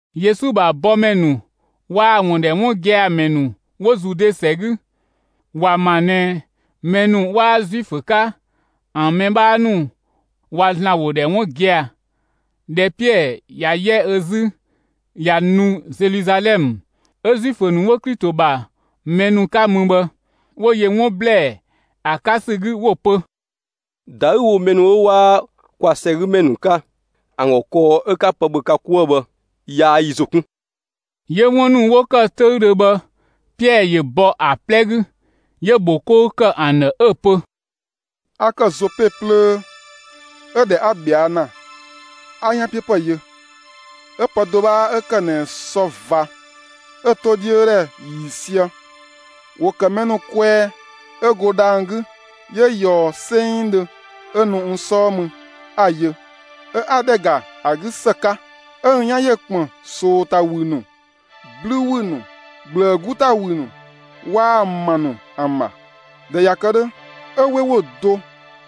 Yesu ‑bha bɔmɛ ‑nu waa‑ ‑wun ‑dhɛ 'wun gia‑ ‑mɛ ‑nu 'wo Zude ‑sɛ 'gü, ‑wa ‑ma ꞊nɛ mɛ ‑nu 'waa Zuifö 'ka ‑an mɛ 'bhaa ‑nu ꞊wa ‑Zlan ‑wo ‑dhɛ 'wun gia‑. ꞊Dhɛ Piɛɛ ꞊ya 'yɛ ö 'zü ꞊ya nu Zeluzalɛmë 'ö Zuifö ‑nu 'wo Klito ‑bha mɛ ‑nu 'ka mü bhë, 'wo yö 'wun ‑blɛɛ ‑a 'ka ‑sü 'gü, 'wo‑ pö: «‑Da 'ü‑ wo mɛ ‑nu 'ö 'waa kwa ‑sɛgümɛ ‑nu 'ka ‑an ‑gɔ kɔɔ 'ö 'ka pë ‑bhö ka 'kuë‑ bhë, yaa yi ‑zo 'kun!» 'Yö 'wun ‑nu 'wo‑ ‑kë 'töüdhö bhë, Piɛɛ ‑yö bɔ ‑a 'plɛ 'gü, 'yö‑ ‑bho 'kou ‑kë ‑an ‑dhë 'ö‑ pö: «A ‑kë Zope plöö, 'ö ꞊dhɛ 'a ꞊bhɛa' ‑na, 'a 'yanpiöpë yö; 'ö pë do 'bhaa 'ö ‑kë ꞊nɛ sɔ ꞊va 'ö‑ 'to 'dhiö ‑dhɛ ‑yiisië, ‑wo ‑kë mɛ ‑nu kwɛɛ 'ö go dhang‑ 'gü 'yö ꞊yɔɔ 'sengdhö 'ö nu n 'sɔɔ mü, 'a‑ yö. 'Ö 'a ‑dhɛ ‑ga ‑a 'gü ‑së 'ka, 'ö n 'yan ‑yö ‑kpën ꞊soo ‑ta ‑wü ‑nu, 'blü ‑wü ‑nu, ꞊gblëë 'gu ‑ta ‑wü ‑nu, waa‑ ‑ma ‑nu ‑an ‑bha. ꞊Dhɛ ꞊ya kë 'dhö, 'ö 'we ‑wo do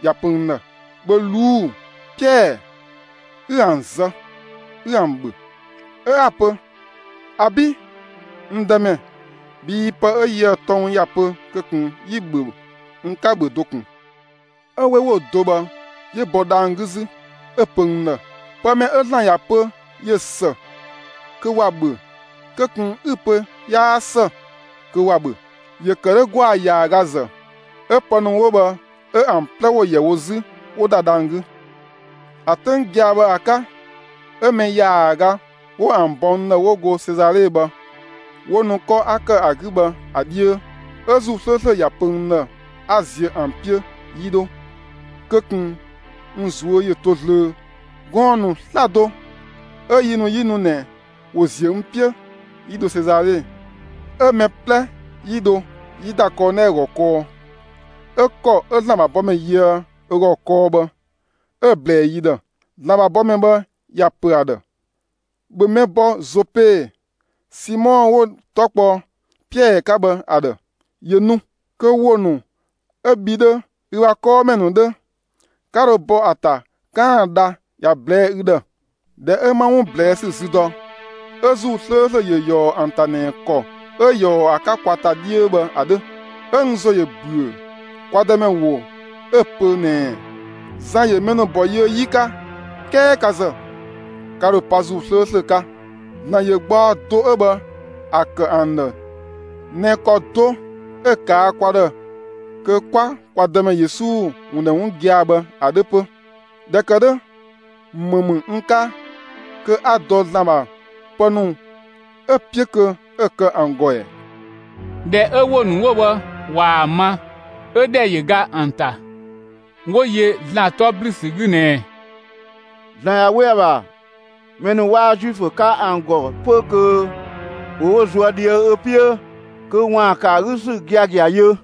‑ya pö n ‑dhë: ‹‑Bhö ꞊luu'‑, Piɛɛ, 'ü ‑an zë, 'ü ‑an ‑bhö!› 'Ö 'a‑ pö: ‹‑Abi', n Dëmɛ, bhii pë 'ö yië‑ tɔng ‑ya pö kö ꞊kun 'yi‑ ‑bhö, n 'ka‑ ‑bhö do ꞊kun.› 'Ö 'we ‑wo do bhë 'yö bɔ dhang‑ 'gü 'zü, 'ö‑ pö n ‑dhë: ‹Pë mɛ 'ö ‑Zlan ‑ya pö ꞊yö ‑së kö ‑wa ‑bhö, kö ꞊kun 'ü‑ pö 'yaa ‑së kö ‑wa ‑bhö!› ‑Yö ‑kë 'dhö ‑gwaa ‑yaagazë 'ö pë ‑nu 'wo bhë 'ö ‑an 'plɛ ‑wo ‑yɛ wo 'zü 'wo ‑da dhang‑ 'gü. ‑A 'töng gia‑ bhë ‑a 'ka, 'ö mɛ ‑yaaga 'wo ‑an bɔ n ‑dhë 'wo go Sezale bhë, 'wo nu 'kɔ 'a ‑kë ‑a 'gü bhë ‑a 'dhiö. 'Ö ‑Zuu 'slööslö ‑ya pö n ‑dhë 'a ziö ‑an 'piö 'yi 'dho, kö ꞊kun n ꞊zuö' ‑yö to zlöö. Gɔɔn‑ ‑nu 'slado 'ö yi ‑nu 'yi nu ꞊nɛ, ‑wo ‑ziö n 'piö 'yi dho Sezale, 'ö mɛ 'plɛ 'yi dho, 'yi ‑da Kɔɔnɛɛ ‑gɔ kɔɔ. 'Ö ‑kɔ 'ö ‑Zlan ‑bha bɔmɛ yöë ö ‑gɔ kɔɔ bhë, 'ö‑ ꞊blɛɛ yi ‑dhë. ‑Zlan ‑bha bɔmɛ bhë ‑ya ‑pö ‑a ‑dhë: ‹‑Bhö mɛ bɔ Zope, Simɔ 'wo‑ 'tɔ kpɔ Piɛɛ 'ka bhë ‑a ‑dhë, ‑yö nu; kö ‑wo ‑nu, 'ö bhi 'dhö, ü ‑bha 'kɔɔmɛ ‑nu 'dhö, 'ka dho bɔ ‑a ‑ta 'kaan‑ dha ‑ya ꞊blɛɛ'‑ ü ‑dhë!› ꞊Dhɛ 'ö 'ma 'wun ꞊blɛɛ ‑sü zü dɔ, 'ö ‑Zuu 'slööslö ‑yö ꞊yɔɔ ‑an ‑ta ꞊nɛ ‑kɔ 'ö ꞊yɔɔ ‑a 'ka kwa ‑ta 'dhiö bhë ‑a 'dhö. 'Ö n ‑zo ‑yö ‑büö kwa Dëmɛ ‑wo 'ö‑ pö ꞊nɛɛ: ‹Zan ‑yö mɛ ‑nu ‑bɔ yiö 'yi 'ka, 'kɛɛ ka ‑zë, ka ‑dho pa ‑Zuu 'slööslö 'ka.› ‑Zlan ‑yö gbaɔ do 'ö bhë ‑a ‑kë ‑an ‑dhë ꞊nɛ ‑kɔ do 'ö‑ ꞊kaa' kwa ‑dhë kö 'kwa kwa Dëmɛ Yesu ‑wun ‑dhɛ 'wun gia‑ bhë ‑a 'dhö 'pö. ꞊Dhɛ ‑kë 'dhö, ‑më ‑mü n 'ka kö 'a dɔ ‑Zlan ‑bha pë ‑nu 'ö‑ 'piö kö 'ö‑ kë ‑an ‑gɔ ‑ɛ?» ꞊Dhɛ 'ö‑ ‑wo ‑nu 'wo bhë ꞊waa‑ ma, 'ö ‑dhɛ ‑yö ga ‑an ‑ta, 'wo yö ‑Zlan 'tɔ 'blü ‑sü 'gü ꞊nɛɛ: «‑Zlan ꞊ya 'we ‑a ‑bha, mɛ ‑nu 'ö 'waa Zuifö 'ka ‑an ‑gɔ 'pö kö ‑wo wo ꞊zuö' ꞊dhië' ö 'piö kö ‑waan ‑kë ‑a 'gü ‑sü giagia yö.»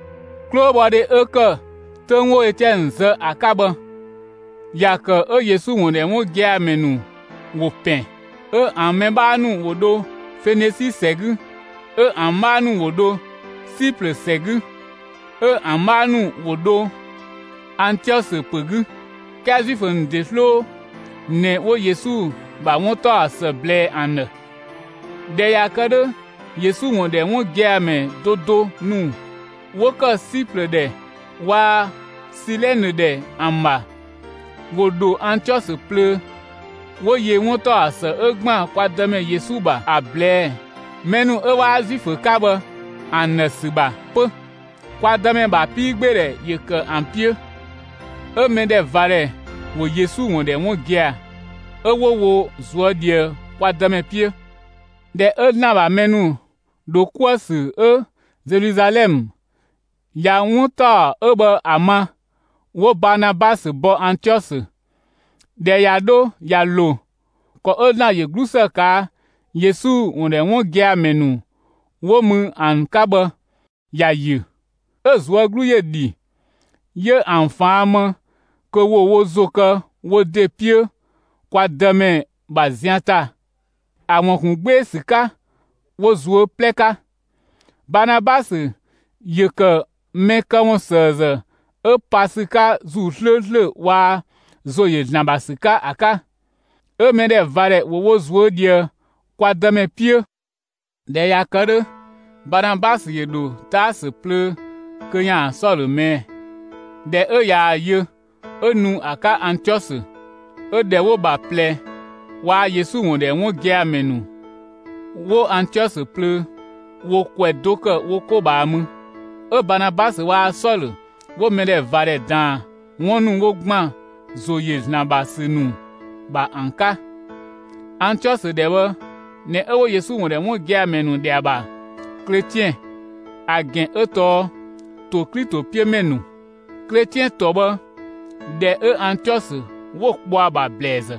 'Klobhɔdhe 'ö ‑kë 'töng 'wo Etiɛnë zë ‑a 'ka bhë, ‑ya ‑kë 'ö Yesu ‑wun ‑dhɛ 'wun gia‑ ‑mɛ ‑nu ‑wo ‑pɛn. 'Ö ‑an mɛ 'bhaa ‑nu ‑wo ‑dho Fenisi ‑sɛ 'gü, 'ö ‑an 'bhaa ‑nu ‑wo dho Siplë ‑sɛ 'gü, 'ö ‑an 'bhaa ‑nu ‑wo ‑dho Antiɔsö ‑pö 'gü, 'kɛɛ Zuifö ‑nu ‑de 'sloo ꞊nɛ 'wo Yesu ‑bha 'wuntaɔsë ꞊blɛɛ ‑an ‑dhë. ꞊Dhɛ ꞊ya kë 'dhö, Yesu ‑wun ‑dhɛ 'wun gia‑ ‑mɛ do do ‑nu 'wo ‑kë Siplë ‑dhɛ waa‑ Silɛnë ‑dhɛ ‑an ‑bha, ‑wo ‑dho Antiɔsö plöö, 'wo yö 'wuntaɔsë 'ö ‑gban kwa Dëmɛ Yesu ‑bha ‑a ꞊blɛɛ, mɛ ‑nu 'ö 'waa Zuifö 'ka bhë ‑an ‑dhë ‑sü ‑bha 'pö. Kwa Dëmɛ ‑bha 'piigbeedhɛ ‑yö ‑kë ‑an 'piö, 'ö mɛdhɛvadhɛ ‑wo Yesu ‑wun ‑dhɛ 'wun gia‑, 'ö 'wo wo ꞊zuö' ꞊dhië kwa Dëmɛ 'piö. ꞊Dhɛ 'ö ‑Zlan ‑bha mɛ ‑nu ‑dho 'kuë‑ ‑sü 'ö Zeluzalɛmë ‑ya 'wun ‑taɔ 'ö bhë ‑a ma, 'wo Baanabasö bɔ Antiɔsö. ꞊Dhɛ ꞊ya 'dho ꞊ya ‑lo, ‑kɔ 'ö ‑Zlan ‑yö 'glusë ꞊kaa' Yesu ‑wun ‑dhɛ 'wun gia‑ ‑mɛ ‑nu 'wo mü ‑an 'ka bhë ‑ya ‑yö. 'Ö‑ ꞊zuö' 'glu ‑yö ‑dhi; 'yö ‑an ꞊faan' më kö ‑wo wo ‑zo kë wo ‑de 'piö kwa Dëmɛ ‑bha zian ‑ta ‑a ‑wun ‑kun 'gbee‑ ‑sü 'ka wo ꞊zuö' 'plɛ 'ka. Baanabasö ‑yö ‑kë mɛ këwunsëëzë 'ö pa ‑sü 'ka ‑Zuu 'slööslö waa‑ ‑zo ‑yö ‑Zlan ‑bha ‑sü 'ka ‑a 'ka. 'Ö mɛdhɛvadhɛ ‑wo wo ꞊zuö' ꞊dhië kwa Dëmɛ 'piö. ꞊Dhɛ ꞊ya kë 'dhö, Baanabasö ‑yö ‑dho Taasö plöö kö ‑yaan Sɔlö ꞊mɛɛ'‑. ꞊Dhɛ 'ö ꞊yaa‑ yö 'ö nu ‑a 'ka Antiɔsö. 'Ö ‑dhɛ 'wo‑ ‑bha ꞊plɛ waa‑ Yesu ‑wun ‑dhɛ 'wun gia‑ ‑mɛ ‑nu 'wo Antiɔsö plöö, ‑wo ‑kwɛ do ‑kë wo 'ko ꞊bhaa mü. 'Ö Baanabasö waa‑ Sɔlö 'wo mɛdhɛvadhɛ ꞊daan 'wun ‑nu 'wo ‑gban ‑zo ‑yö ‑Zlan ‑bha ‑sü ‑nu ‑bha ‑an 'ka. Antiɔsö ‑dhɛ bhë ꞊nɛ 'ö 'wo Yesu ‑wun ‑dhɛ 'wun gia‑ ‑mɛ ‑nu ‑dhɛ ‑a ‑bha «Kletiɛn» (‑a ‑gɛn 'ö tɔɔ «‑to Klito 'piö ‑mɛ ‑nu»). Kletiɛn ‑tɔ 'ö bhë, ‑dhɛ 'ö Antiɔsö 'wo‑ kpɔ ‑a ‑bha ‑blɛɛzë.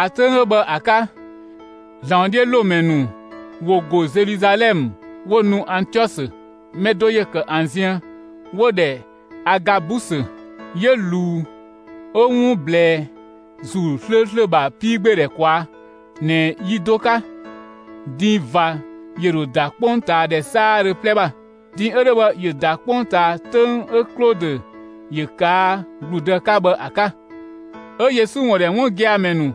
‑A 'töng 'ö bhë ‑a 'ka, ‑Zlan ‑wodhiölomɛ ‑nu ‑wo ‑go Zeluzalɛmë 'wo nu Antiɔsö. Mɛ do ‑yö ‑kë ‑an ziën 'wo‑ ‑dhɛ Agabusö; 'yö ꞊luu 'ö 'wun ꞊blɛɛ ‑Zuu 'slööslö ‑bha 'piigbeedhɛ ꞊kwaa' ꞊nɛ yi do 'ka, din ꞊va ‑yö ‑dho ‑da 'kpongtaadhɛ 'saadhö 'plɛ ‑bha. (Din 'ö 'dhö bhë ‑yö ‑da 'kpongtaa 'töng 'ö Klodö ‑yö ꞊kaa' ‑gludë 'ka bhë ‑a 'ka). 'Ö Yesu ‑wun ‑dhɛ 'wun gia‑ ‑mɛ ‑nu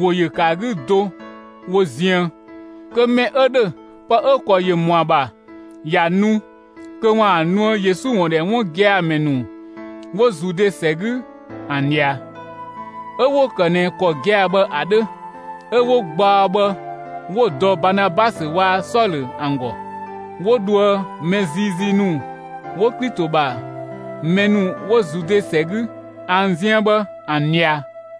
‑wo ‑yö ‑kë ‑a 'gü do wo ziën, kö mɛ 'ö ‑dhö, pë 'ö‑ ‑kɔ ‑yö ‑mɔa ‑bha ‑ya nu kö ‑waan nuë Yesu ‑wun ‑dhɛ 'wun gia‑ ‑mɛ ‑nu 'wo Zude ‑sɛ 'gü ‑an ꞊dhia. 'Ö 'wo‑ ‑kë ꞊nɛ ‑kɔ gia‑ bhë ‑a 'dhö, 'ö 'wo gbaɔ bhë 'wo‑ dɔ Baanabasö waa‑ Sɔlö ‑an ‑gɔ, 'wo dhoë mɛ ziizii ‑nu 'wo Klito ‑bha mɛ ‑nu 'wo Zude ‑sɛ 'gü ‑an ziën bhë, ‑an ꞊dhia.